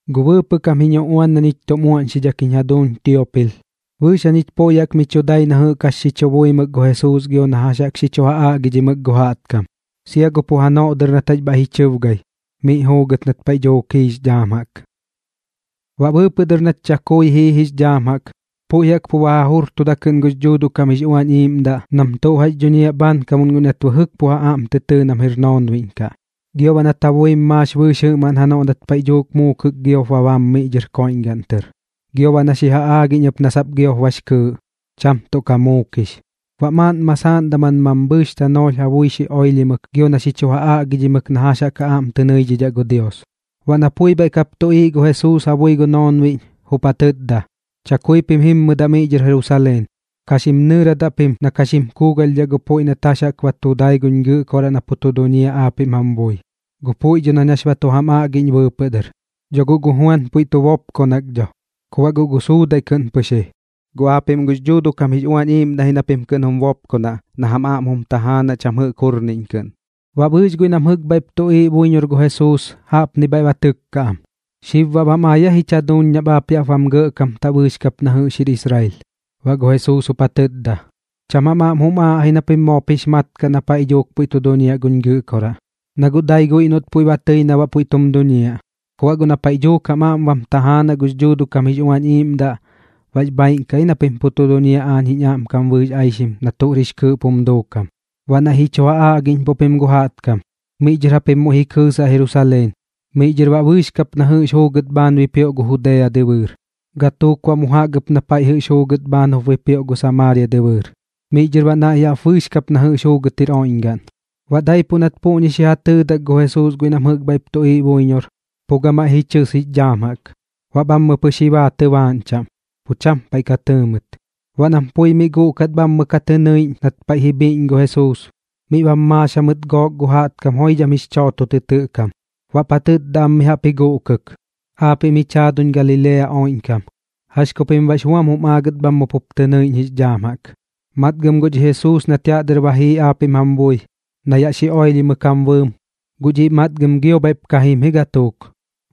Gu bɨɨpɨꞌ kam jiñ uꞌuan na ñich tum uaꞌñxidhak jiñ jaduuñ Tiopil, bɨɨx jañich puiꞌ jaꞌk mi chu dai na jɨꞌk tuꞌ jax xi buimɨk gu Jesuus gio na jax jaꞌk xi chu ja aꞌgidhimɨk gu jaꞌtkam, sia gu pu janoꞌ dɨr nat jax bhaiꞌ ji chɨbgai, miꞌ juugɨt nat paiꞌ dhuuk jiix dhaam jaꞌk. Baꞌ bɨɨpɨꞌ dɨr nat chakui jiix dhaam jaꞌk, puiꞌ jaꞌk pu ba ja jujurtuda kɨꞌn gux Dhuuduꞌ kam jix Uañ Iiꞌmdaꞌ nam tuꞌ jax dhuñiaꞌ bhaankamuꞌn guiꞌ nat jɨꞌk pu ja aꞌm tɨ tɨɨ nam jir noonbiꞌñ kaꞌ. Gio baꞌ nat ja buim maax bɨɨx jɨꞌmaꞌn janoꞌ nat paiꞌ dhuuk muukɨk giop ba bam miꞌ dhɨr koiꞌñgaꞌn tɨr, gio baꞌ na xi ja aꞌgiꞌñ ɨp na sap giop bax kɨɨꞌ, cham tuꞌ ka muukix. Baꞌ maaꞌn masaaꞌn daman mambhɨɨx tanoolh ja bui xi oilhimɨk gio na xi chu ja aꞌgidhimɨk na jax jaꞌk ja aꞌm tɨ nɨidhidhaꞌ gu Dios. Baꞌ na pui bhaiꞌ kap tuꞌiiꞌ gu Jesuus ja bui gu noonbiꞌñ, jup ja tɨtda: ―Chakui pim jimmɨdaꞌ miꞌ dhɨr Jerusaleen. Ka xim nɨɨradaꞌ pim na ka xim kuugalhdhaꞌ gu puiꞌ nat jax jaꞌk ba tu dai guñ Gɨꞌkoraꞌ na pu tu duñiaꞌ aapiꞌm jam bui, gu puiꞌ dho nañ jax ba tu jam aꞌgiꞌñ bɨɨpɨꞌ dɨr. Dho guꞌ gu Juan puiꞌ tu bopkonak dho, ku baꞌ guꞌ gu suudaiꞌ kɨꞌn pɨx ji, guꞌ aapiꞌm gux Dhuuduꞌ kam jix Uañ Iiꞌmdaꞌ ji na pim kɨꞌn jum bopkonaꞌ na jam aꞌm jum tajaanaꞌ cham jɨꞌk jurniꞌñ kɨꞌn. Baꞌ bɨɨx guiꞌ nam jɨꞌk bhaiꞌp tuꞌiiꞌ buiñor gu Jesuus jaꞌpni bhaiꞌ ba tɨkka am: ―¿Xib baꞌ bam ai aa jich jaduuñ nap aap yaꞌp bam gɇꞌkamtaꞌ bɨɨx kap na jɨꞌx jir Israel? Baꞌ gu Jesuus jup ja tɨtda: ―Cham jam aꞌm jum aaꞌ ji na pim moop jix mat kaꞌ na paiꞌ dhuuk puiꞌ tu duñiaꞌ guñ Gɨꞌkoraꞌ, na guꞌ dai guiꞌ noꞌt puiꞌ ba tɨi na baꞌ puiꞌ tum duñiaꞌ. Ku baꞌ guꞌ na paiꞌ dhuuk jam aꞌm bam tajaanaꞌ gux Dhuuduꞌ kam jix Uañ Iiꞌmdaꞌ, bax bhaaiꞌn kaꞌ ji na pim pu tu duñiaꞌ aañ jiñ aꞌmkam bɨɨx aixim na tuꞌr jix kɨɨꞌp jum duukam, baꞌ naiꞌ ji chu ja aꞌgiꞌñpuꞌ pim gu jaꞌtkam. Miꞌ dhɨr japim muiꞌ ji kɨɨsaꞌ Jerusaleen, miꞌ dhɨr baꞌ bɨɨx kap na jɨꞌx juugɨt bhaan bipioꞌ gu Judea dɨbɨɨr, gatuuk baꞌ mu jaꞌk ɨp na paiꞌ jɨꞌx juugɨt bhaan jup bipioꞌ gu Samaaria dɨbɨɨr, miꞌ dhɨr baꞌ naiꞌ jaꞌp bɨɨx kap na jɨꞌx juugɨt jir oiꞌñgaꞌn. Baꞌ daipuꞌ nat puꞌñi xi ja tɨɨdak gu Jesuus guiꞌ nam jɨꞌk bhaiꞌp tuꞌiiꞌ buiñor, pu gamaiꞌ ji chɨs jix dhaam jaꞌk, baꞌ bhammɨ pɨx ji baa tɨbaaꞌñ chaꞌm, pu cham paiꞌ ka tɨɨ mɨt. Baꞌ nam pui miꞌ guꞌkat bhammɨ jaꞌk ka tɨ nɨiꞌñ nat paiꞌ ji bhiꞌñ gu Jesuus, miꞌ bam maax jamɨt gook gu jaꞌtkam joidham jix chooto tɨtɨꞌ kam, baꞌp ja tɨtda am mi jaꞌp ji guꞌkɨk: ―Aapiꞌm jich jaaduñ Galilea oiꞌñkam, ¿jax ku pim baꞌx buam jum aagɨt bhammɨ jaꞌk pup tɨ nɨiꞌñ jix dhaam jaꞌk? Matgɨm guꞌ dhi Jesuus nat yaꞌ dɨr ba jii aapiꞌm jam bui, na yaꞌ xi oilhimɨk jam bɨɨm, guꞌ dhiꞌ matgɨm gio bhaiꞌp ka jim ji gatuuk.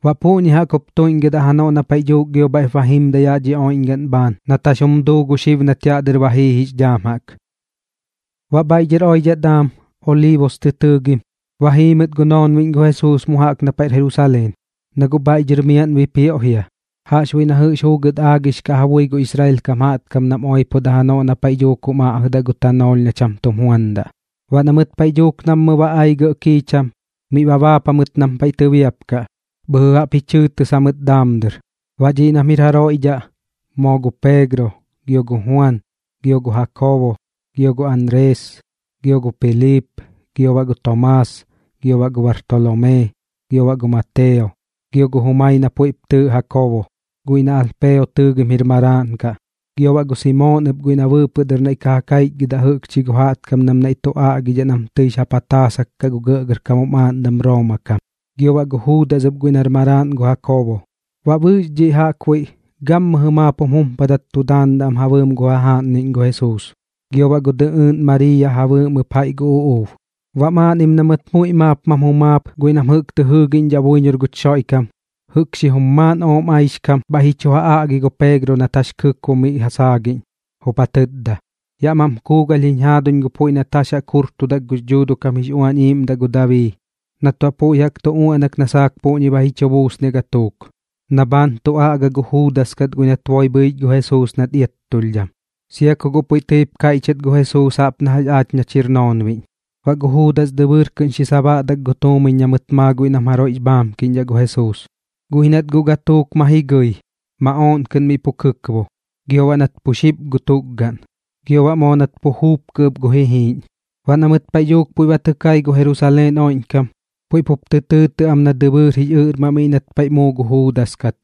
Baꞌ puꞌñi jaꞌk jup tuiꞌñgɨdaꞌ janoꞌ na paiꞌ dhuuk gio bhaiꞌp jimdaꞌ yaꞌ dhi oiꞌñgaꞌn bhaan nat jax jum duu gu xib nat yaꞌ dɨr ba jiix dhaam jaꞌk. Baꞌ bhaiꞌ dhɨr oidhaꞌ daam Oliibus tɨ tɨɨgim, ba jii mɨt gu noonbiꞌñ gu Jesuus mu jaꞌk na paiꞌr Jerusaleen, na guꞌ bhaiꞌ dhɨr miaꞌn bipioꞌ jia, jaꞌxbuiꞌ na jɨꞌx juugɨt aagix kaꞌ ja bui gu Israel kam jaꞌtkam nam oipodaꞌ janoꞌ na paiꞌ dhuuk jum aꞌjɨdaꞌ gu tanoolh na cham tum juandaꞌ. Baꞌ na mɨt paiꞌ dhuuk mummɨ ba ai gɇꞌ kiicham, miꞌ ba baap jamɨt nam paiꞌ tɨbiapkaꞌ, bhɨjɨ jaꞌp ji chɨɨtis jamɨt daam dɨr. Baꞌ dhiꞌ nam jir jaroiꞌ dhaꞌ moo gu Peegro, gio gu Juan, gio gu Jakoobo, gio gu Anrees, gio gu Piliip, gio baꞌ gu Tomaas, gio baꞌ gu Bartolomee, gio baꞌ gu Mateo, gio gu jumai na puiꞌp tɨɨꞌ Jakoobo, guiꞌ na Alpeo tɨɨgim jir maraaꞌn kaꞌ, gio baꞌ gu Simoon ɨp guiꞌ na bɨɨpɨꞌ dɨr naiꞌ ka ja kaichgɨdaꞌ jɨꞌkchi gu jaꞌtkam nam naiꞌ tu aꞌgidhaꞌ nam tɨix ja pataasak kaꞌ gu gɇꞌgɇrkam jum aaꞌndam Rooma kam, gio baꞌ gu Juudas ɨp guiꞌ nar maraaꞌn gu Jakoobo. Baꞌ bɨɨx dhiꞌ jaꞌkbuiꞌ gammɨjɨ maap jum jumpadat tu daandaꞌ am ja bɨɨm gu jajaaꞌnniꞌñ gu Jesuus, gio baꞌ gu dɨꞌɨɨꞌn Mariiya ja bɨɨm ɨp jaiꞌ gu uꞌuub. Baꞌ maaꞌnnim na mɨt muiꞌ maap mam jumaap guiꞌ nam jɨꞌk tɨ jɨɨgiꞌñdhaꞌ buiñor guch Xoiꞌkam, jɨꞌk xijum maaꞌn ooꞌm aixkam, bhaiꞌ ji chu ja aꞌgi gu Peegro nat jax kɨkbo miꞌ ja saagiꞌñ, jup ja tɨtda: ―Yaꞌ mam kuugalh jiñ jaaduñ gu puiꞌ nat jax jaꞌk jurtudak gux Dhuuduꞌ kam jix Uañ Iiꞌmdaꞌ gu Dabii nat baꞌ puiꞌ jaꞌk tu uaꞌnak na saak puꞌñi ba ji chu buusniaꞌ gatuuk, na bhaan tu aꞌga gu Juudas kat guiꞌ nat boi bhɨich gu Jesuus nat iattulhdham, sia ku guꞌ puiꞌ tɨip kaichgɨt gu Jesuus jaꞌp na jax aach nach jir noonbiꞌñ. Baꞌ gu Juudas dɨbɨɨr kɨꞌn xi sabaꞌdak gu tuumiñ na mɨt maa guiꞌ nam jaroiꞌx bhaamkiꞌñdhaꞌ gu Jesuus, guꞌ ji nat guꞌ gatuuk ma ji gɨi, maꞌooꞌn kɨꞌn miꞌ pu kɨkbo, gio baꞌ nat pu xip ɨp gu tukgaꞌn, gio baꞌ moo nat pu juupkɨ ɨp gu jijiiꞌñ. Baꞌ na mɨt paiꞌ dhuuk puiꞌ ba tɨ kai gu Jerusaleen oiꞌñkam, puiꞌ pup tɨ tɨɨtɨꞌ am nar Dɨbɨɨr jix Ɨꞌrmaꞌ miꞌ nat paiꞌ muu gu Juudas kat.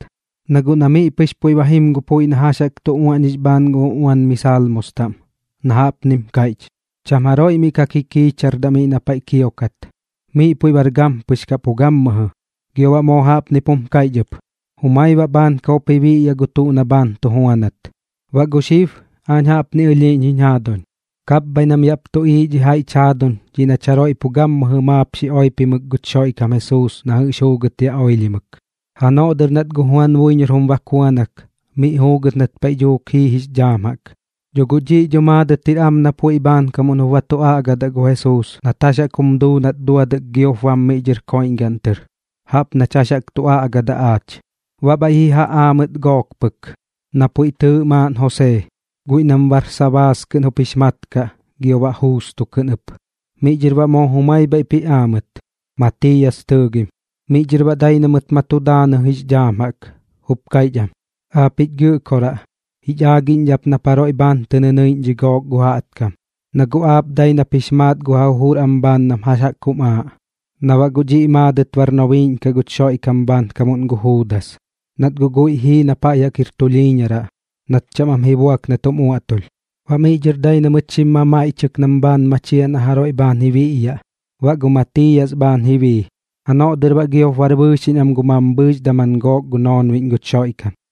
Na guꞌ na miꞌ pɨx puiꞌ ba jim gu puiꞌ na jax jaꞌk tu uaꞌñix bhaan gu uꞌuan mi Salmos taꞌm, na jaꞌpnim kaiꞌch: Cham jaroiꞌ miꞌ ka kikiichardaꞌ miꞌ na paiꞌ kiokat, miꞌ puiꞌ bar gampɨx kaꞌ pu gammɨjɨ. Gio baꞌ moo jaꞌpnip jum kaiꞌch ɨp: Jumai baꞌ bhaankam jup ji biꞌyaꞌ gu tuꞌ na bhaan tu juanat. ’Baꞌ gu xib aañ jaꞌpni ɨlhiiꞌñ jiñ jaaduñ, kapbhaiꞌ nam yaꞌp tuꞌiiꞌ dhi jaiꞌch jaaduñ dhiꞌ nach jaroiꞌ pu gammɨjɨ maap xi oipimɨk guch Xoiꞌkam Jesuus na jɨꞌx juugɨt yaꞌ xi oilhimɨk, janoꞌ dɨr nat gu Juan buiñor jum bakuanak miꞌ juugɨt nat paiꞌ dhuuk jii jix dhaam jaꞌk. Dho guꞌ dhiꞌ dho maadɨt jir am na puiꞌ bhaankam jup ba tu aꞌgadaꞌ gu Jesuus nat jax jaꞌk jum duu nat duadɨk giop bam miꞌ dhɨr koiꞌñgaꞌn tɨr, jaꞌp nach jax jaꞌk tu aꞌgadaꞌ aach. Baꞌ bhaiꞌ ji ja aa mɨt gook pɨk, na puiꞌ tɨɨꞌ maaꞌn Josee, guiꞌ nam Barsabaas kɨꞌn jup jix mat kaꞌ gio baꞌ Juusto kɨꞌn ɨp. Miꞌ dhɨr baꞌ moo jumai bhaiꞌp ji aa mɨt ɨp, Matiiyas tɨɨgim. Miꞌ dhɨr baꞌ dai na mɨt ma tu daanɨ jix dhaam jaꞌk, jup kaiꞌch am: ―Aapiꞌ jich Gɨꞌkoraꞌ, jich aagiꞌñdhaꞌ ap nap jaroiꞌ bhaan tɨ nɨnɨiꞌñ dhi gook gu jaꞌtkam, na guꞌ aap dai nap jix maat gu ja jujur am bhaan nam jax jaꞌk jum aaꞌ, na baꞌ guꞌ dhiꞌ maadɨt bar nobiiꞌñ kaꞌ guch Xoiꞌkam bhaankam gu Juudas, nat guꞌ guiꞌ jii na paiꞌ jaꞌk jir tulhiiñaraꞌ nat cham am ji buak nat jum uaꞌtulh. Baꞌ miꞌ dhɨr dai na mɨt xim mamaiꞌchɨk nam bhaan machiaꞌ na jaroiꞌ bhaan ji biꞌyaꞌ. Baꞌ gu Matiiyas bhaan ji bii. Janoꞌ dɨr baꞌ giop bar bɨɨxiꞌñ am gu mambhɨɨx daman gook gu noonbiꞌñ guch Xoiꞌkam.